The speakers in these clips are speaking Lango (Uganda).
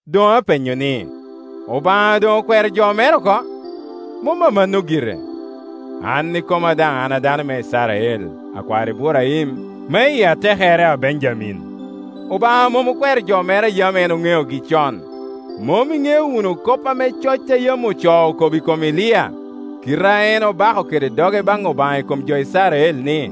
Doŋ apenyo ni, “Obaŋa doŋ okwero jo mere oko?” Mom amanno gire. An ikoma daŋ an dano me Icrael, akwar Iburaim, me i atekere a Benjamin. Obaŋa mom okwero jo mere a yam en oŋeogi con. Mom iŋeo wunu kop ame coc a yam ocoo okobo i kom Elia, kite a en obako kede doge baŋ Obaŋa i kom jo Icrael ni,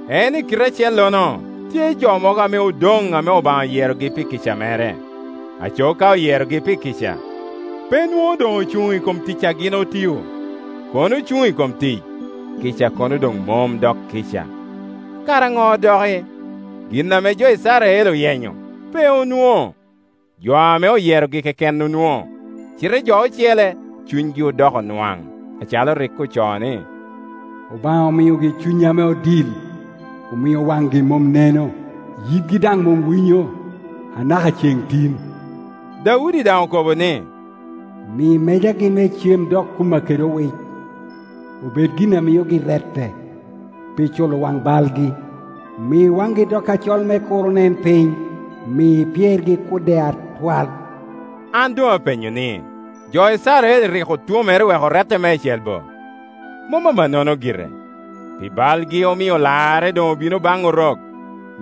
En i kite acellono tye jo mogo ame odoŋ ame Obaŋa oyerogi pi kica mere. Aco ka oyerogi pi kica, pe nwoŋo doŋ ocuŋ i kom tic a gin otio; kono ocuŋ i kom tic, kica kono doŋ mom dok kica. Kara ŋo doki? Gin ame jo Icrael oyenyo, pe onwoŋo. Jo ame oyerogi keken onwoŋo, cite jo ocele cunygi odoko nwaŋ, acalo rik ocoo ni, “Obaŋa omiogi cuny ame odil, omio waŋgi mom neno, yitgi daŋ mom winyo, anaka ceŋ tin.” Daudi daŋ okobo ni, “Mi mejagi me cem dok kumma kede owic, obed gin a miogi rette, pi culo waŋ balgi. Mi waŋgi dok acol me kur onen piny; mi pyergi kudde atwal.” An doŋ apenyo ni, “Jo Icrael rik otwomere wek orette meicel bo?” Mom amannono gire! Pi balgi omio larre, doŋ obino baŋ Orok,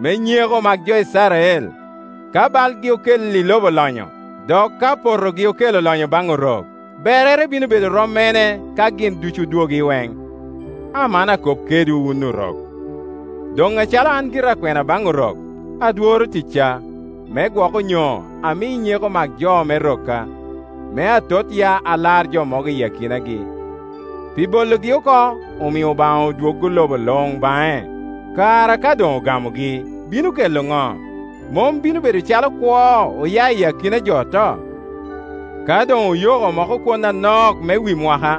me nyeko mak jo Icrael. Ka balgi okelli lobo lonyo, dok ka potogi okelo lonyo baŋ Orok, berre bino bedo rom mene ka gin ducu odwogo iweŋ? Aman akop kedwu, wun Orok. Doŋ acalo an gira akwena baŋ Orok, adworo ticca, me gwok onyo ami nyeko mak jo me rokka, me atot ya alar jo mogo i akinagi. Pi bologi oko omio Obaŋa odwoggo lobo luŋ baŋe; kara ka doŋ ogamogi, bino kela ŋo? Mom bino bedo calo kwo oya i akina jo oto? Ka doŋ oyoko moko kwon an ok me wi mwaka,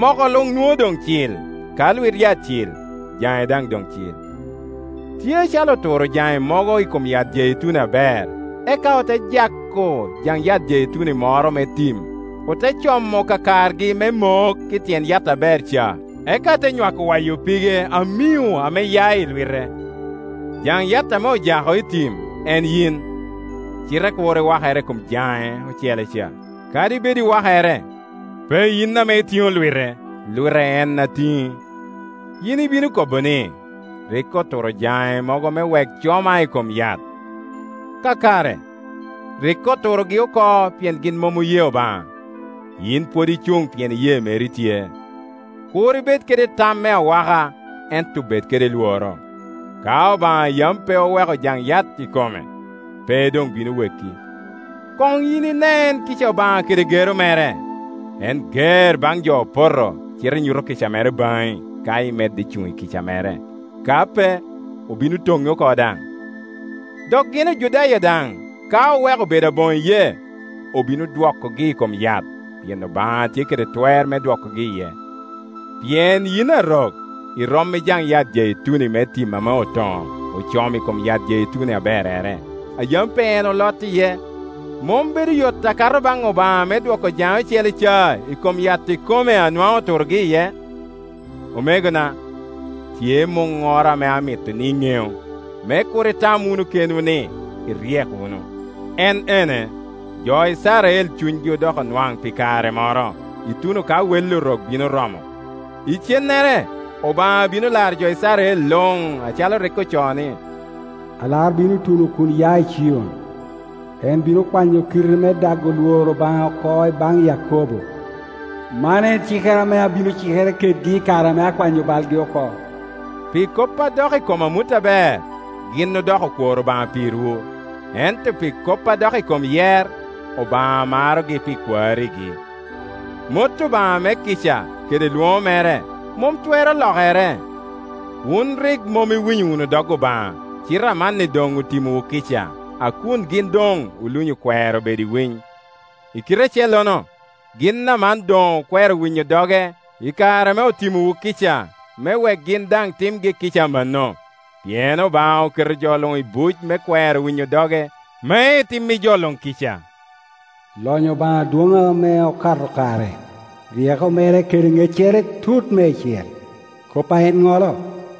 moko luŋ nwoŋo doŋ cil; ka lwit yat cil, jaŋe daŋ doŋ cil. Tye acalo oturo jaŋe mogo i kom yat jeituni aber, eka ote jako jaŋ yat jeituni moro me tim, ote como kakargi me mok i tyen yat aber ca, eka te nywako waya pige amio ame ya i lwite. Jaŋ yat ame ojako i tim en yin; cite kur iwakere i kom jaŋe ocele ca. Kadi bed iwakere, pe yin ame itiŋo lwite, lwite en a tiŋi. Yin ibino kobo ni, “Rik oturo jaŋe mogo me wek coma i kom yat.” Kakare. Rik oturogi oko pien gin mom oye Obaŋa; yin pwod icuŋ pien iyee meri tye. Kur ibed kede tam me awaka, ento bed kede lworo. Ka Obaŋa yam pe oweko jaŋ yat ikome, pe doŋ bino weki. Koŋ yin inen kica Obaŋa kede gero mere. En ger baŋ jo opoto, cite nyuto kica mere baŋi, ka imedde cuŋ i kica mere. Ka pe, obino toŋi oko daŋ. Dok gin Ojudaya daŋ, ka oweko bedo aboŋo iyee, obino dwokogi i kom yat; pien Obaŋa tye kede twer me dwokogi iye. Pien yin Arok irom i jaŋ yat jeituni me tim ame otoŋo, ocomo i kom yat jeituni aberrere, a yam pe en olot iye; mom bedo yot akato baŋ Obaŋa me dwoko jaŋe ocele ca i kom yat ikome a nwaŋ oturogi iye? Omegona, tye muŋŋoro ame amito ni iŋeu, me kur itam wunu kenwu ni iryek wunu. En ene: jo Icrael cunygi odoko nwaŋ pi kare moro, ituno ka wel Orok bino romo. Icennere Obaŋa bino laro jo Icrael luŋ, acalo rik ocoo, ni, “Alar bino tuno kun ya i Cion, en bino kwanyo kite me dago lworo Obaŋa oko i baŋ Yakobo”; “man en cikere ame abino cikere kedgei i kare ame akwanyo balgi oko.” Pi kop a dok i kom amut aber, gin odoko okwor Obaŋa pirwu, ento pi kop a dok i kom yer. Obaŋa marogi pi kwarigi. Mot Obaŋa me kica, kede lwoŋo mere, mom twero lokere. Wun rik mom iwinyo wunu dog Obaŋa, cite amanni doŋ otimowu kica, a kun gin doŋ olunyo kwero bedo i winy. I kite acellono, gin amanni doŋ okwero winyo doge i kare ame otimowu kica, me wek gin daŋ timgi kica amanno. Pien Obaŋa oketo jo luŋ i buc me kwero winyo doge, me etim i jo luŋ kica. Lonyo Obaŋa dwoŋ ame okato kare! Ryeko mere kede ŋeccere tut meicel! Kop a en ŋolo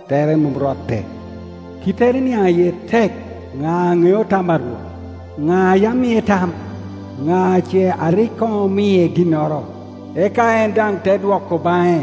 tere mom rotte; kittere niaŋ iye tek! “Ŋa aŋeo tam a Rwot? Ŋa a yam mie tam?” “Ŋa ce a rik koŋ omie ginnoro, eka en daŋ te dwoko baŋe?”